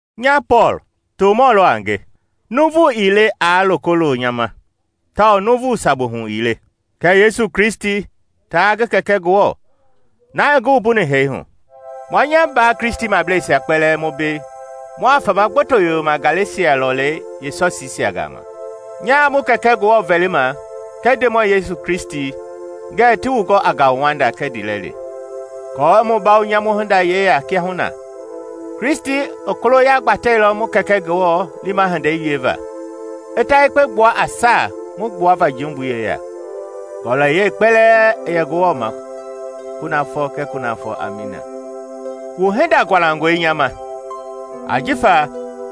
Nya Pɔɔl, tomɔ lɔ a nge, nuuvu ii le aa loko lo nya ma tawao nuuvu sabu hu ii le, kɛ Yesu Kristi taa ngi Kɛkɛ Ngewɔ, na i ngi wumbuni hee hu. Mua nya mbaa Kristimableisia kpɛlɛɛ mu mbei mua fama gboto yoyoma Galesia lɔlei yee sɔsiisia gama. Nyaa mu Kɛkɛ Ngewɔ vɛlima kɛɛ Ndemɔi Yesu Kristi ngɛɛ ti wu gɔ a ngauwanda kɛɛ ndiilɛli. Aako i mu bawo nyamu hinda yeya kiahuna, Kristi i koloya gbatɛilɔ mu Kɛkɛ Ngewɔ lima hindei wieva i ta yekpe gbua a saa mu gbuava jumbui yeya. Ngɔlɔyɛi kpɛlɛɛ i yɛ Ngewɔ ma kunafɔ kɛɛ kunafɔ. Amiina. Wu hinda gualangɔe nya ma ajifa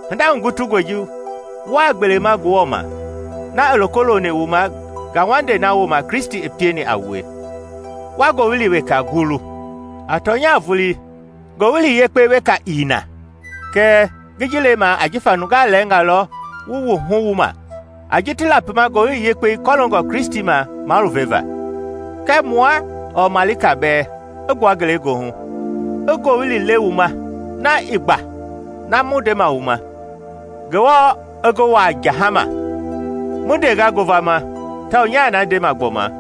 hinda hugutungɔi ji wuaa gbelema Ngewɔ na ma i loko loni wu ma ngauwandei na wooma Kristi i pieni a wue, wa ngowili weka gulu. A tɔnya vulii, “Ngowili yekpe” weka ii na, kɛɛ ngi ji lemaa ajifa nungaa lɛɛngaa lɔ wu wuhu wuma a ji ti lapima Ngowili Yekpei kɔloongɔ Kristi ma maluveva. Kɛɛ mua ɔɔ malika bɛɛ i gbua ngelegoohu i ngowili le wu ma na i gba na ma mu ndeni wu ma, Ngewɔ i ngi wuaa jahama. Mu ndenga ngovama tawao nyaa na ndema gbɔma: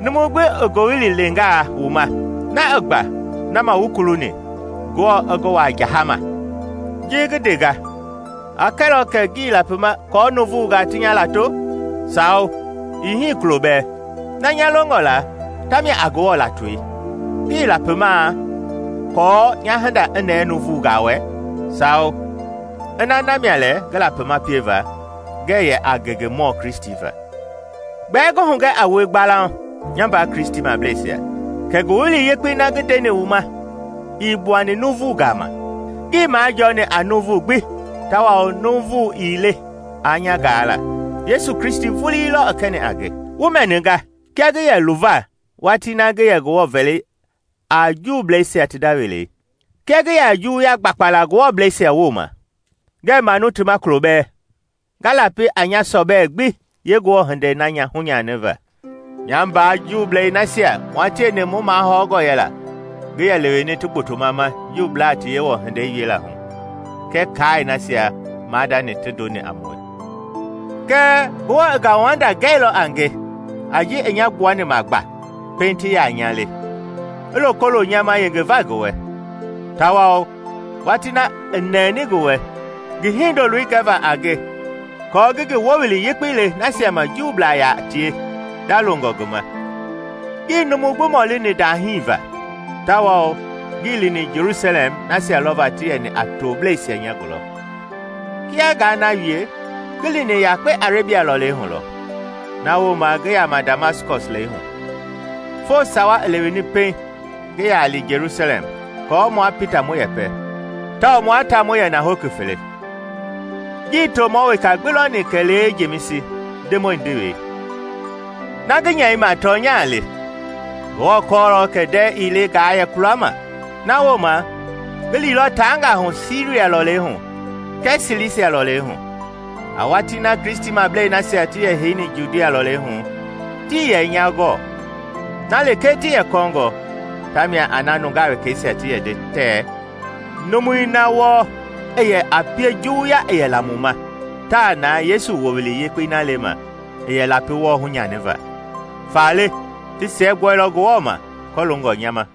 numu gbi i ngowili lengaa wu ma na i gba na ma wu kuluni, Ngewɔ i ngi wuaa jahama. Ji ngi ndenga a kɛlɔ kɛ ngi lapimaa kɔɔ nuuvunga ti nya lato? Sawo, ii hii kulo bɛɛ! Na nya longɔ la ta mia a Ngewɔ latoi! Ngi lapimaa aako nya hinda i nɛɛ nuuvungaa wɛ? Sawo, ina na mia lɛ ngi lapimaa pieva, ngɛ yɛ a ngengemɔ Kristi va. Gbɛɛ ngi hugɛ a wue gbalauŋ, nya mbaa Kristimableisia, kɛ Ngowili Yekpei na ngi ndeni wu ma ii gbuani nuuvu gama. Ngii majɔɔni a nuuvu gbi tawao numu ii le aa nya gaa la. Yesu Kristi vulii lɔ i kɛni a nge. Wu mɛninga kia ngi yɛ luva watii na ngi yɛ Ngewɔ vɛli a Juubleisia ti nda welei, kia ngi yɛ a Juwuya gbakpa la Ngewɔblɛisia wooma, ngɛɛ manu ti ma kulo bɛɛ, nga lapi a nya sɔbɛi gbi yee Ngewɔ hindei na hunyaniva. Nya mbaa Juublei nasia mua tieni mu mahɔngɔ yɛla ngi yɛ leweni ti gbotoma ma Juublaa ti Yewɔ hindei wiela hu kɛɛ kaai nasia maadani ti ndoni a mue. Kɛɛ Ngewɔ i ngauwanda wieilɔ a nge a ji i nya gbuani ma gba pɛiŋ ti yaa nya le, i loko lo nya ma yengeva ngi wɛ. Tawao watii na i nɛni ngi wɛ ngi Hindoloi gɛva a nge aako ngi ngi Ngowili Yekpei le nasia ma Juublaa yaa tie ndalongɔ ngi ma, ngii numu gbi mɔlii ndahii va, tawao ngii lini Jelusalɛm nasia lɔva ti yɛni a toblɛisia nya gulɔ. Kia ngaa na wie, ngi lini yakpe Arebia lɔlei hu lɔ, na wooma ngi yama Damaskɔs lɛi hu. Foo sawa i leweni pɛiŋ ngi yaa li Jelusalɛm aako mua Pita mu yɛpɛ, tawao mua ta mu yɛ na hoki fele. Ngii tomɔ weka gbi lɔni kɛlee Jemisi, Ndemɔi ndewei. Na ngi nyɛima tɔnya le. Ngewɔ kɔɔlɔ kɛ ndɛɛ ii le ngaa yɛ kulama. Na wooma ngi liilɔ taangaa hu Siria lɔlei hu kɛɛ Silisia lɔlei hu. A watii na Kristimablei nasia ti yɛ heiheini Judia lɔlei hu tii yɛ nya gɔɔ. Na lekee ti yɛ kɔɔngɔ ta mia a na nungaa wekeisia ti yɛ nde tɛɛ, “Numui na wɔɔ i yɛ a pie juwuya i yɛ la mu ma taa na Yesu Wowili Yekpei na lema i yɛ lapi wɔɔ hunyaniva.” Faale ti siɛgbuɛilɔ Ngewɔ ma kɔloongɔ nya ma.